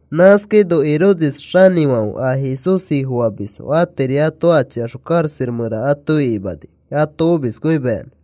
Nãskaino Herodes xanĩfãfe a Jesús Ifofamisfo atiri ato achixõ karaxa mẽra ato ikimani ato omiskõimayanã.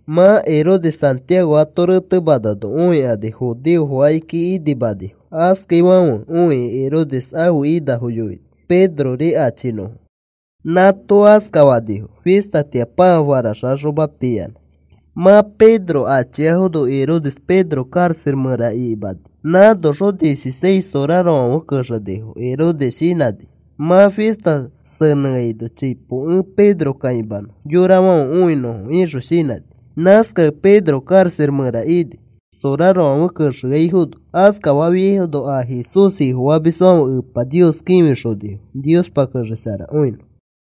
Mã Herodes Santiago ato retemanano õikani judeofo akiki inimanifo. Askafaifãfe õikĩ Herodes ãfe inafo yoini Pedrori achinõfo. Nãato askafanifo fistatĩa pãa faraxaxoma piyanã. Mã Pedro achiafono Herodes Pedro karaxa mẽra ikimani. Nãnoxõ dieciseis sorarofãfe kexenifo. Herodes shinãni: “Mã fista senẽano chipo ẽ Pedro kãimanõ yorafãfe õinõfo,” ixõ shinãni. Nãskakẽ Pedro karaxa mẽra ini, sorarofãfe kexekõiafono. Askafafiaifono a Jesús Ifofamisfãfe Epa Nios kĩfixonifo Niospa kexesharakõinõ.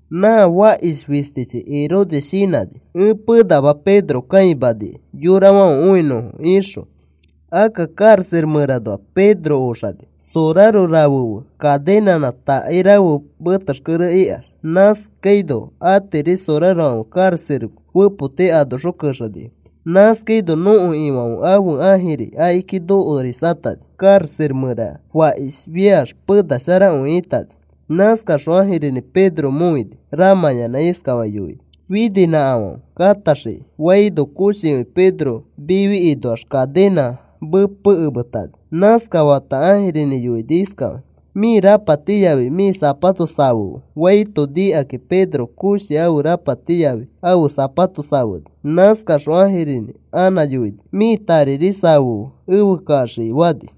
Nã fakish fistichi Herodes shinãni: “Ẽ penama Pedro kãimanikai yorafãfe õinõfo,” ixõ, akka karaxa mẽranoax Pedro oxani soraro rafe fe cadenãnã takai rafe metexkere ikax. Nãskaino atiri sorarofãfe karaxa fepoti anoxõ kexeshinifo. Nãskaino nõko Ifãfe ãfe ãjiri akiki nokorisatani. Karaxa mẽra fakishfiax penasharakõi ĩtani. Nãskaxõ ãjirinĩ Pedro mõini ramãyanã iskafakĩ yoini: “Fininãkafãfe kataxiki,” faino koshikõi Pedro mifi inoax cadenãs mepekemetani. Nãskafata ãjirinĩ yoini iskafakĩ: “Mĩ rapati yafi mĩ sapato safefe,” faito nikakĩ Pedro koshi ãfe rapati yafi ãfe sapato safeni. Nãskaxõ ãjirinĩ anã yoini: “Mĩ tariri safefe efe kaxiki,” fani.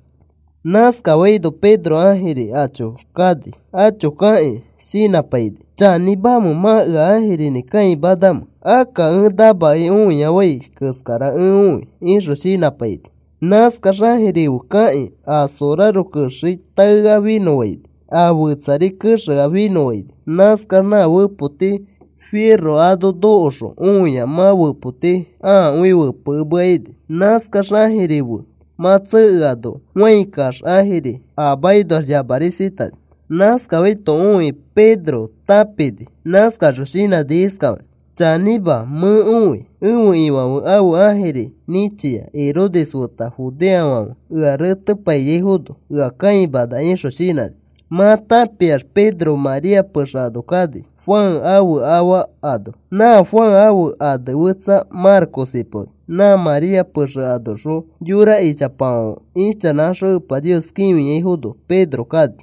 Nãskafaino Pedro ãjiri acho kani. Acho kakĩ shinãpaini: “¿Chanĩmamẽ mã ea ãjirinĩ kãimanamẽ? Akka ẽ namakẽ õiafai keskara ẽ õi,” ixõ shinãpaini. Nãskax ãjiri fe kakĩ a soraro kexei taea finõfaini. A fetsari kexea finõfaini. Nãskax nã fepoti firo ano nokoxõ õia, mã fepoti ãakõi fepekemea ini. Nãskax ãjiri fe mã tsekeano fãi kaax ãjiri a makinoax yamarisatani. Nãskafaito õikĩ Pedro tãpini. Nãskaxõ shinãni iskafakĩ: “Chanĩma, mẽ õi ẽfe Ifãfe ãfe ãjiri nĩchia. Herodes feta judeofãfe ea retepaiyaifono ea kãimana,” ixõ shinãni. Mã tãpiax Pedro María pexe ano kani, Juan ãfe afa ano. Nã Juan ãfe ane fetsa Marcos ipaoni. Nã María pexe anoxõ yora ichapafãfe ichanãkaxõ Epa Nios kĩfiaifono Pedro kani.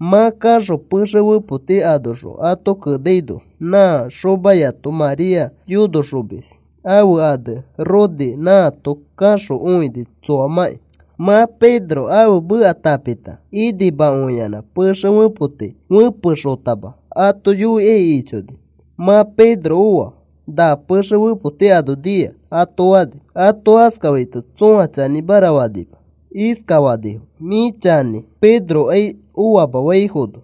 Mã kaxõ pexe fepoti anoxõ ato kenaino, nã xomayato María yonoxomis ãfe ane Rode, nãato kaxõ õini tsoamãki. Mã Pedro ãfe meka tãpikãta, inimakõiyanã pexe fepoti fẽpexotama ato yoikai ichoni. “Mã Pedro oa. Na pexe fepoti ano nia,” ato fani. Ato askafaito tsõa chanĩmara fanima. Iskafanifo: “Mĩ chanĩ, Pedrokai oama,” faifono,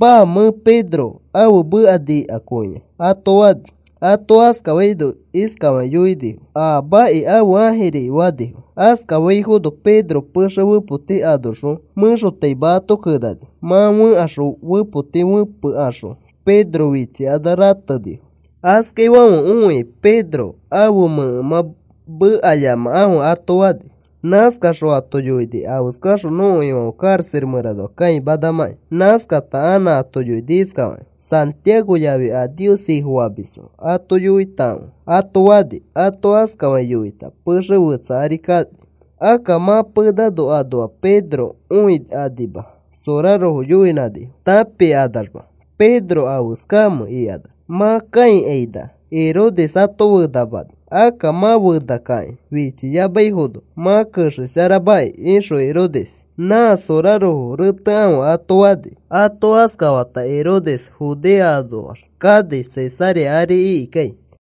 “Maa, mẽ Pedro ãfe meka nikakõia,” ato fani. Ato askafaino iskafakĩ yoinifo: “Aamaki, ãfe ãjiriki,” fanifo. Askafaifono Pedro pexe fepoti anoxõ mẽxotaima ato kenani. Mã fẽkaxõ fepoti fepekaxõ Pedro fichikanax ratenifo. Askaifãfe õikĩ Pedro ãfe mẽkemã mekayamakãfe ato fani. Nãskaxõ ato yoini afeskaxõ nõko Ifãfe karaxa mẽranoa kãimanamãkĩ. Nãskata anã ato yoini iskafakĩ: “Santiago yafi a Nios Ifofamisfo ato yoitakãfe,” ato fani. Ato askafakĩ yoita pexe fetsa ari kani. Akka mã penano anoa Pedro õikanima sorarofo yoinãnifo, tãpikanamax Pedro afeskamẽ ikanax. Mã kãikaina nikaxõ, Herodes ato fenamani, “Akka mã fenafikãki fichiyamaifono mã kexesharamaki,” ixõ Herodes, “Nã sorarofo retekãfe,” ato fani. Ato askafata Herodes Judea anoax kani Cesarea ari ikikai.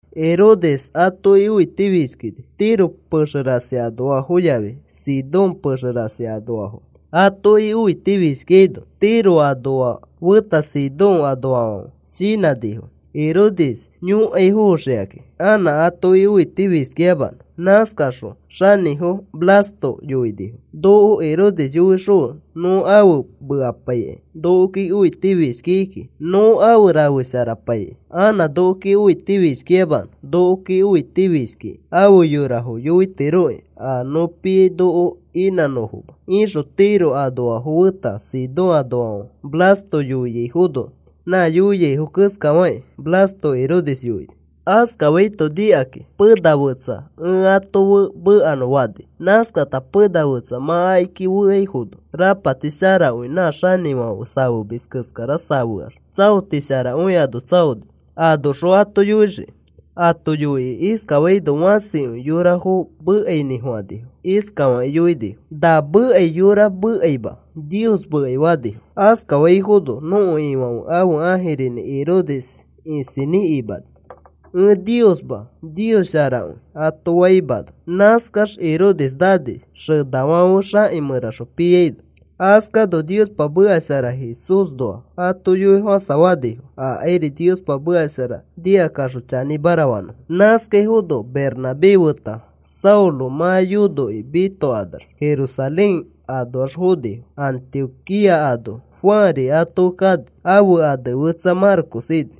Herodes atoki õitifishkini Tiro pexe rasi anoafo yafi Sidón pexe rasi anoafoki. Atoki õitifishkikaino Tiro anoa feta Sidón anoafãfe shinãnifo Herodes yõkaifoxikakĩ anã atoki õitifishkiyamanõ. Nãskakaxõ xanĩfo Blasto yoinifo: “Noko Herodes yoixõfe nõ afe mekapaikai. Nokoki õitifishkiki kiki, nõ afe rafepaisharaikai anã nokoki õitifishkiyamanõ. Nokoki õitifishkiki afe yorafo yoitiroki a nõ piai noko inãnõfoma,” ixõ Tiro anoafo feta Sidón anoafãfe Blasto yoiaifono. Nã yoiaifo keskafakĩ Blasto Herodes yoini. Askafaito nikakĩ, “Pena fetsa ẽ ato fe mekanõ,” fani. Nãskata pena fetsa mã akiki feaifono, rapati sharakõi nã xanĩfãfe safemis keskara safeax tsaoti sharakõi ano tsaoni, anoxõ ato yoixiki. Ato yoikĩ askafaino fãsikõi yorafo mekainĩfofãnifo. Iskafakĩ yoinifo: “Na mekai yora mekaima, nios mekai,” fanifo. Askafaifono nõko Ifãfe ãfe ãjirinĩ Herodes isinĩ imani, “Ẽ Niosma. Nios sharakõi,” ato faimano. Nãskax Herodes nani xenafãfe xaki mẽraxõ piaino. Askano Niospa meka shara Jesúsnoa ato yoifofãsafanifo akairi Niospa meka shara nikakaxõ chanĩmara fanõfo. Nãskafaifono Bernabé feta Saulo mã yonokĩ mitokanax Jerusalén anoax fonifo, Antioquía ano. Juanri ato fe kani, ãfe ane fetsa Marcos ini.